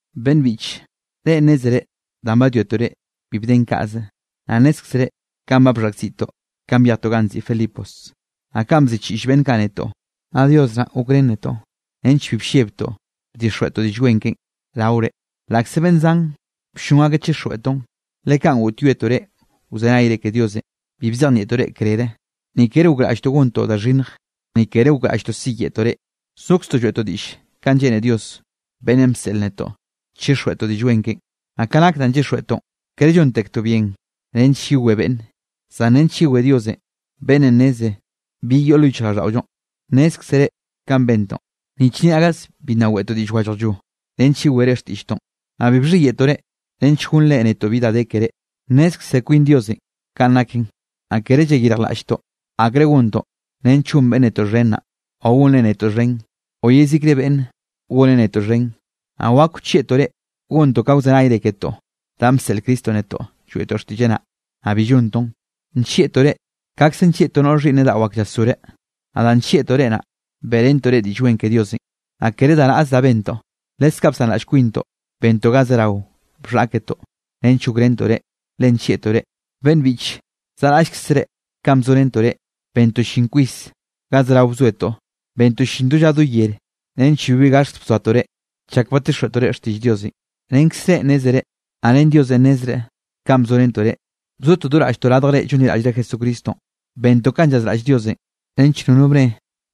Beꞌnn biꞌche, reꞌ nnézere danꞌ badwiatoꞌ reꞌ, bi bden kaꞌze. Naꞌ nnézkzere kanꞌ bxhaꞌkziꞌtoꞌ kanꞌ byejtoꞌ ganꞌ nziꞌi Filipos, naꞌ kanꞌ bziꞌchiꞌll beꞌnn kaꞌ netoꞌ. Naꞌ Dios naꞌ gokrén netoꞌ nench bi bllebtoꞌ bdixjweꞌtoꞌ Diꞌll Wen keꞌen raore, laꞌkze beꞌnn zan bllon akeꞌ chixjweꞌtoꞌn. Le kanꞌ goꞌtyoetoꞌ reꞌ wzenayre ke Diosenꞌ, bi bzejnieꞌtoꞌ reꞌ krere, ni kere gokraꞌlltoꞌ gontoꞌ da xhinnj, ni kere gokraꞌlltoꞌ siyeꞌtoꞌ reꞌ. Zokztoꞌ lloeꞌtoꞌ diꞌll kanꞌ lleꞌne Dios, beꞌnnenꞌ bseꞌl netoꞌ chixjweꞌtoꞌ Diꞌll Wen keꞌen. Naꞌ ka nak danꞌ llyixjweꞌtoꞌn, kere llontektoꞌ bien nench yewé beꞌnne, zan nench yewé Diosenꞌ beꞌnnenꞌ nneze bi yoꞌ lo yichjraꞌlldaꞌollonꞌ. Nnézkzere kanꞌ bentoꞌ, ni chnia gaze bi nna weꞌtoꞌ diꞌll wallajllo nench yewere xtiꞌlltoꞌn, naꞌ bi bxhiyeꞌtoꞌ reꞌ nench gonnre netoꞌ bi da de keré. Nnezkze kwin Diosenꞌ kaꞌn naken. Naꞌ kere llayirjlaꞌlltoꞌ akre gontoꞌ nench gon beꞌnn netoꞌ xhen naꞌ o gonre netoꞌ xhen, o yezikre beꞌnn goneꞌ netoꞌ xhen. Naꞌ wak wchieꞌtoꞌ reꞌ gontoꞌ ka wzenayre ketoꞌ da bseꞌl Cristonꞌ netoꞌ lloeꞌtoꞌ xtiꞌlleꞌ naꞌ, naꞌ bi llontoꞌn. Nllieꞌtoꞌ reꞌ kaꞌkze nllieꞌ to noꞌre xhiꞌnneꞌ daꞌo ak llasgoreꞌ. Naꞌ danꞌ nllieꞌtoꞌ reꞌ naꞌ, beꞌrentoꞌ reꞌ Diꞌll Wen ke Diosenꞌ. Naꞌ kere da naꞌze da bentoꞌ, leskaꞌ bsanraꞌll kwintoꞌ bentoꞌ ga zerao bxhaꞌketoꞌ nench gokrentoꞌ reꞌ, le nllieꞌtoꞌ reꞌ. Beꞌnn biꞌche zaꞌraꞌllkzere kanꞌ bzorentoꞌ reꞌ, bentoꞌ llin kwis ga zerao bzoetoꞌ. Bentoꞌ llin do lla do yere nench bibi gaxt bzoatoꞌ reꞌ, chak badtixjweꞌtoꞌ reꞌ xtiꞌll Diosenꞌ. Renkzrenꞌ nnézere naꞌ ren Diosenꞌ nnezreꞌ, kanꞌ bzorentoꞌ reꞌ, bzotoꞌ do raꞌlltoꞌ radj reꞌ llonliraꞌll Jesucristonꞌ. Bentoꞌ kanꞌ llazraꞌll Diosenꞌ nench nono bne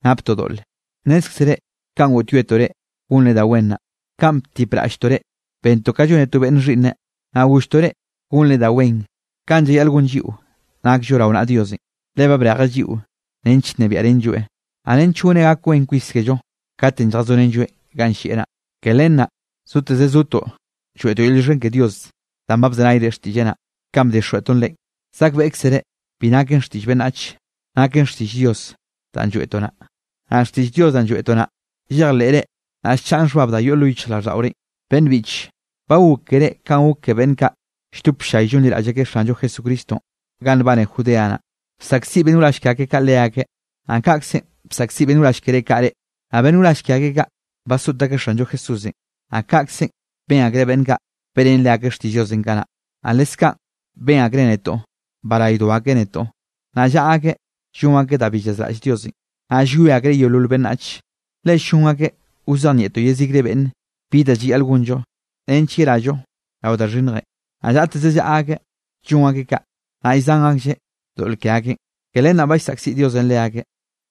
naptoꞌ doꞌle. Nnézkzere kanꞌ goꞌtyoetoꞌ reꞌ gonre da wen naꞌ, kanꞌ btipraꞌlltoꞌ reꞌ. Bentoꞌ ka llone to beꞌnne xhiꞌnneꞌ. Naꞌ golltoꞌ reꞌ gonre da wen kanꞌ llayaꞌl gon lliꞌo nakllo rao naꞌa Diosenꞌ, le ba brejeꞌ lliꞌo nench nnebiaꞌrenlloeꞌ, naꞌ nench goneꞌ gak wen kwis kello katenꞌ lljazorenlloeꞌ ganꞌ llieꞌ naꞌ. Ke len naꞌ zoteze zotoꞌ lloeꞌtoꞌ yel llioxken ke Dios danꞌ ba bzenayre xtiꞌlleꞌ naꞌ, kanꞌ bdixjweꞌtoꞌn reꞌ. Zakbeꞌkzere bi naken xtiꞌll beꞌnnach, naken xtiꞌll Dios danꞌ lloeꞌtoꞌ naꞌ. Naꞌ xtiꞌll Dios danꞌ lloeꞌtoꞌ naꞌ, llejleꞌre naꞌ llchaꞌn xhbab da yoꞌ lo yichjraꞌlldaꞌorenꞌ. Beꞌnn biꞌche, ba gok keré kanꞌ gok ke beꞌnn kaꞌ lldop ll-llay llonliraꞌll akeꞌ Xanllo Jesucristonꞌ ganꞌ nbane Judea naꞌ. Bsaꞌkziꞌ beꞌnn wrall ke akeꞌ kaꞌ leakeꞌ, naꞌ kaꞌkzenꞌ basaꞌkziꞌ beꞌnn wrall kere kaꞌ reꞌ. Naꞌ beꞌnn wrall ke akeꞌ kaꞌ, basoꞌt akeꞌ Xanllo Jesúsenꞌ, naꞌ kaꞌkze ben akreꞌ beꞌnn kaꞌ beꞌrén leakeꞌ xtiꞌll Diosenꞌ kanaꞌ. Naꞌ leskaꞌn ben akreꞌ netoꞌ baraydo akeꞌ netoꞌ. Naꞌ llaꞌa akeꞌ llon akeꞌ da bi llazraꞌll Diosenꞌ, naꞌ llwie akreꞌ yeolol beꞌnnach, le ll-llon akeꞌ wzejnieꞌtoꞌ yezikre beꞌnne bi da llayaꞌl gonllo nench yerallo rao da xhinnjenꞌ. Naꞌ llaꞌteze llaꞌa akeꞌ llon akeꞌ kaꞌ, naꞌll llzan aklleꞌ doꞌl ke akeꞌn, ke len naꞌ ba llsaꞌkziꞌ Diosenꞌ leakeꞌ.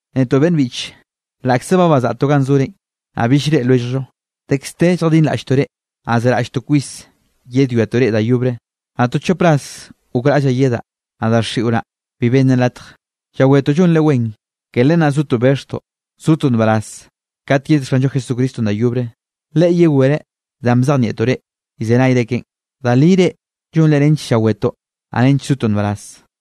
Netoꞌ, beꞌnn biꞌche, laꞌkze ba bazaꞌtoꞌ ganꞌ zorenꞌ, naꞌ bill llreꞌe lwelljllo, dekz de lljadinraꞌlltoꞌ reꞌ, naꞌ zeraꞌlltoꞌ kwis yedwiatoꞌ reꞌ da yobre. Naꞌ to chop ras gokraꞌllaꞌ yedaꞌ, naꞌ daxiꞌo naꞌ bi bennen latje. Llawetoꞌ llonre wen, ke len naꞌ zotoꞌ bexhtoꞌ sotoꞌ nbaraz kat yed Xanllo Jesucristonꞌ da yobre, Leꞌe yewereꞌ danꞌ bzejnieꞌtoꞌ reꞌ llzenayre keꞌen. Da li reꞌ llonre nench llawetoꞌ naꞌ nench zotoꞌ nbaraz.